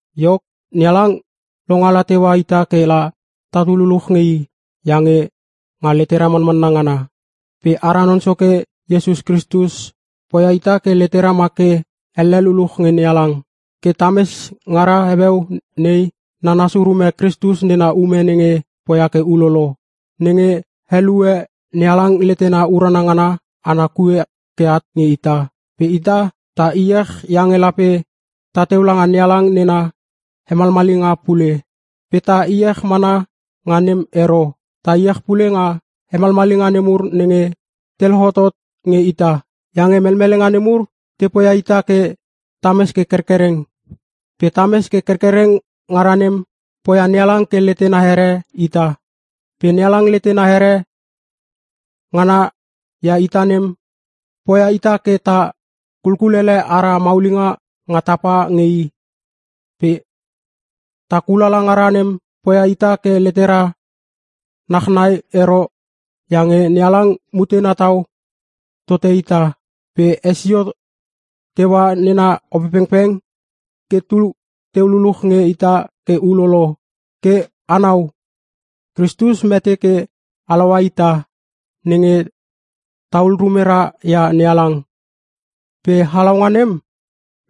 Iok, NeHalang longala teua ita ke la tatu luluch nge i iange nga letera manmanna ngana. Pe ara Non Soke Iesus Kristus poia ita ke letera ma ke elle luluch nge NeHalang. Ke tames ngara heueu nei nanas urume Kristus nena ume nenge poia ke ulolo, nenge helue NeHalang letena urana ngana ana kue ke at nge ita. Pe ta iech iange lape tateu langa NeHalang nena hemalmalinga pule. Pe ta iech mana nga nem ero. Ta iech pule nga melmelenga nemur nenge te lohotot nge ita. Iange melmelenga nemur te poia ita ke tames ke kerkereng. Pe tames ke kerkereng ngara nem poia NeHalang ke letena here ita. Pe NeHalang letena here ngana ia ita nem, poia ita ke ta kulkulele ara maulinga nga tapa nge i. Pe ta kulala ngara nem poia ita ke letera nachnai ero iange NeHalang mutena tau tote ita pe hesio teua nena Opepengpeng ke tu teu luluch nge ita ke ulolo. Ke anau, Kristus mete ke halaua ita nenge tahul rumera ia NeHalang. Pe halaunga nem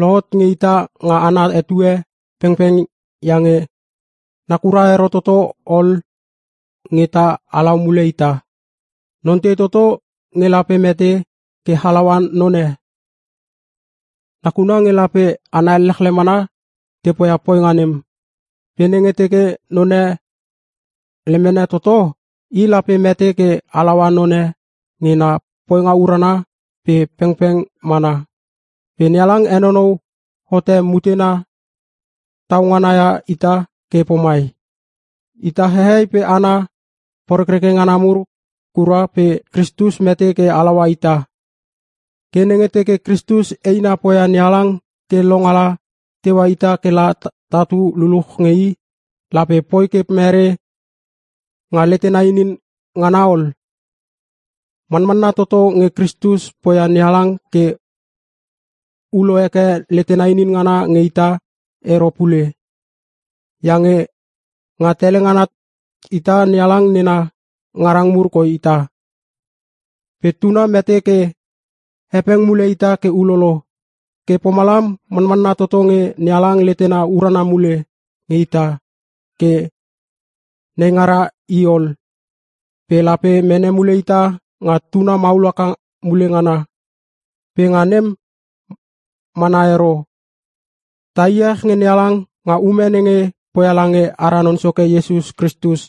lohot nge ita nga ana etue pengpeng iange nakura ero toto ol nge ta halau mule ita. Non tei toto nge lape mete ke halaua non e? Nakuna nge lape hana elechle mana tepoia poinga nem. Pe nenge teke non e lemene toto, i lape mete ke halaua non e nge na poinga urana pe pengpeng mana. Pe NeHalang henonou hote mutena tau ngana ia ita ke pomai: Ita hehei pe hana porekreke ngana mur kura pe Kristus mete ke halaua ita. Ke nenge teke Kristus eina poia NeHalang ke longala teua ita ke la tatu luluch nge i, lape poi ke mere nga letena inin ngana ol? Manmanna toto nge Kristus poia NeHalang ke ulo heke letena inin ngana nge ita ero pule! Iange nga tele ngana ita NeHalang nena ngarang mur koi ita. Pe Tuna mete ke hepeng mule ita ke ulolo. Ke pomalam manmanna toto nge NeHalang letena urana mule nge ita ke neingara i ol, pe lape mene mule ita nga Tuna maul haka mule ngana! Pe nga nem mana ero, ta iech nge NeHalang nga ume nenge poia lange ara Non Soke Iesus Kristus,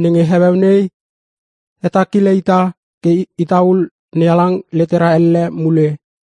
nenge heueu nei hetakile ita ke itaul NeHalang letera elle mule.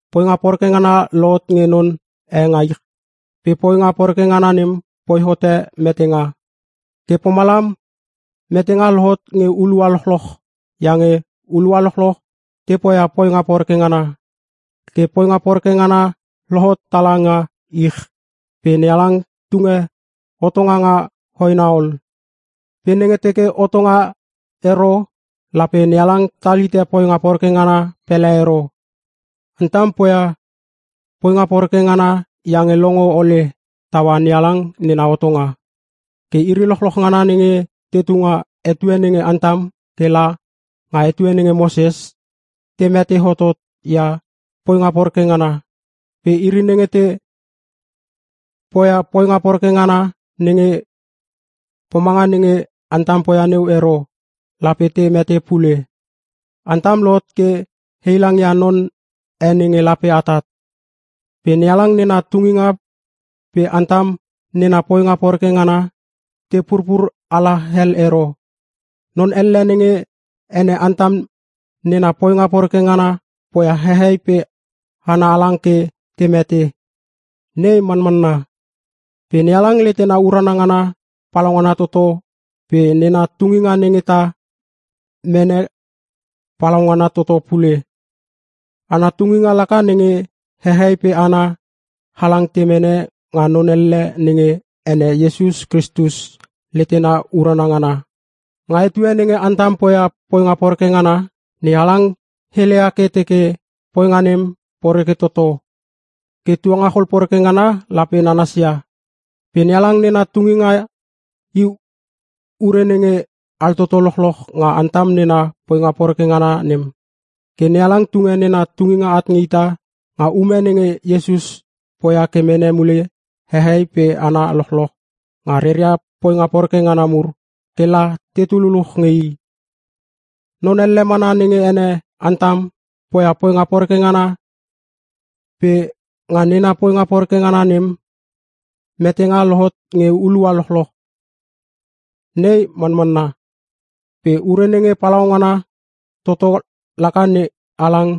Poinga poreke ngana lohot nge non e nga ich pe poinga poreke ngana nem poi hote metenga. Ke pomalam metenga lohot nge hulua lochloch iange hulua lochloch te poia poinga poreke ngana. Ke poinga poreke ngana lohot tala nga ich pe NeHalang tunge hotonga nga hoena ol. Pe nenge teke hotonga ero lape NeHalang tal hite poinga poreke ngana pele ero. Antam poia poinga poreke ngana iange longo ole taua NeHalang nena hotonga. Ke iri lochloch ngana nenge tetu nga etue nenge Antam ke la nga etue nenge Moses, te mete hotot ia poinga poreke ngana, pe iri nenge te poia poinga poreke ngana nenge pomanga nenge Antam poia neu ero, lape te mete pule. Antam lohot ke heilangia non e nenge lape atat. Pe NeHalang nena tunginga pe Antam nena poinga poreke ngana, te purpur ala hel ero. Non elle nenge ene Antam nena poinga poreke ngana poia hehei pe hana halang ke te mete. Nei manmanna. Pe NeHalang letena urana ngana palaungana toto pe nena tunginga nenge ta mene palaungana toto pule. Ana tunginga laka nenge hehei pe hana halang te mene nga non elle nenge ene Iesus Kristus letena urana ngana. Nga etue nenge Antam poia poinga poreke ngana, NeHalang heleia ke teke poinga nem poreke toto ke tuangachol poreke ngana lape nanasia. Pe NeHalang nena tunginga i ure nenge altoto lochloch nga Antam nena poinga poreke ngana nem. Ke NeHalang tunge nena tunginga at nge ita nga ume nenge Iesus poia ke mene mule hehei pe hana lochloch nga reria poinga poreke ngana mur ke la tetu luluch nge I. Non elle mana nenge ene Antam poia poinga poreke ngana pe nga nena poinga poreke ngana nem, metenga lohot nge hulua lochloch. Nei manmanna. Pe ure nenge palaungana toto laka NeHalang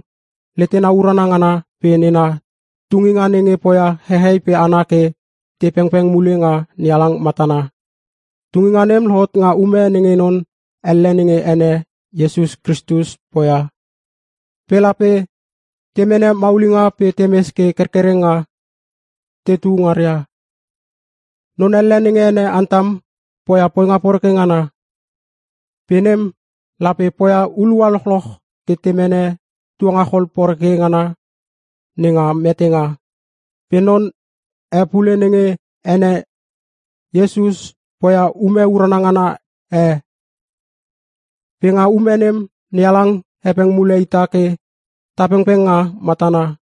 letena urana ngana pe nena tunginga nenge poia hehei pe hana ke te pengpeng mule nga NeHalang matana. Tunginga nem lohot nga ume nenge non elle nenge ene Iesus Kristus poia. Pe lape te mene maulinga pe temes ke kerkereng nga tetu ngaria. Non elle nenge ene Antam poia poinga poreke ngana. Pe nem lape poia hulua lochloch ke te mene tuangachol poreke ngana nenga metenga. Pe non e pule nenge ene Iesus poia ume urana ngana e. Pe nga ume nem NeHalang hepeng mule ita ke ta pengpeng nga matana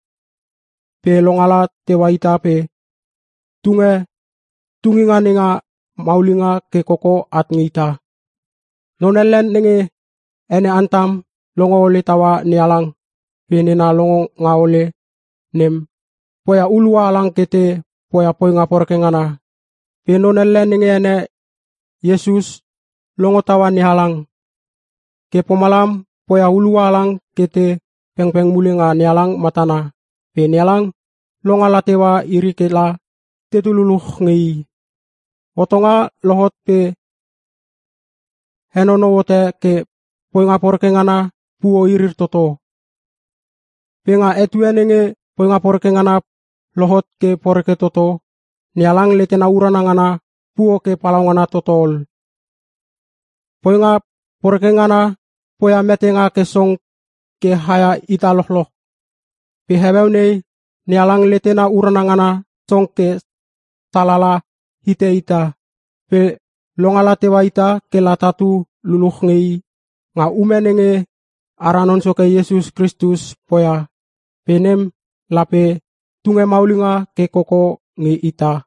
pe longala teua ita pe tunge tunginga nenga maulinga ke koko at nge ita. Non elle nenge ene Antam longo ole taua NeHalang pe nena longonga ole nem poia hulua halang ke te poia poinga poreke ngana. Pe non elle nenge ene Iesus longo taua NeHalang. Ke pomalam poia hulua halang ke te pengpeng mule nga NeHalang matana pe NeHalang longala teua iri ke la tetu luluch nge I. Hotonga lohot pe henonou hote ke poinga poreke ngana puo irir toto. Pe nga etue nenge poinga poreke ngana lohot ke poreke toto, NeHalang letena urana ngana puo ke palaungana toto ol. Poinga poreke ngana poia metenga ke song ke haia ita lochloch. Pe heueu nei NeHalang letena urana ngana song ke salala hite ita. Pe longala teua ita ke la tatu luluch nge i nga ume nenge ara Non Soke Iesus Kristus poia, pe nem lape tunge maulinga ke koko nge ita.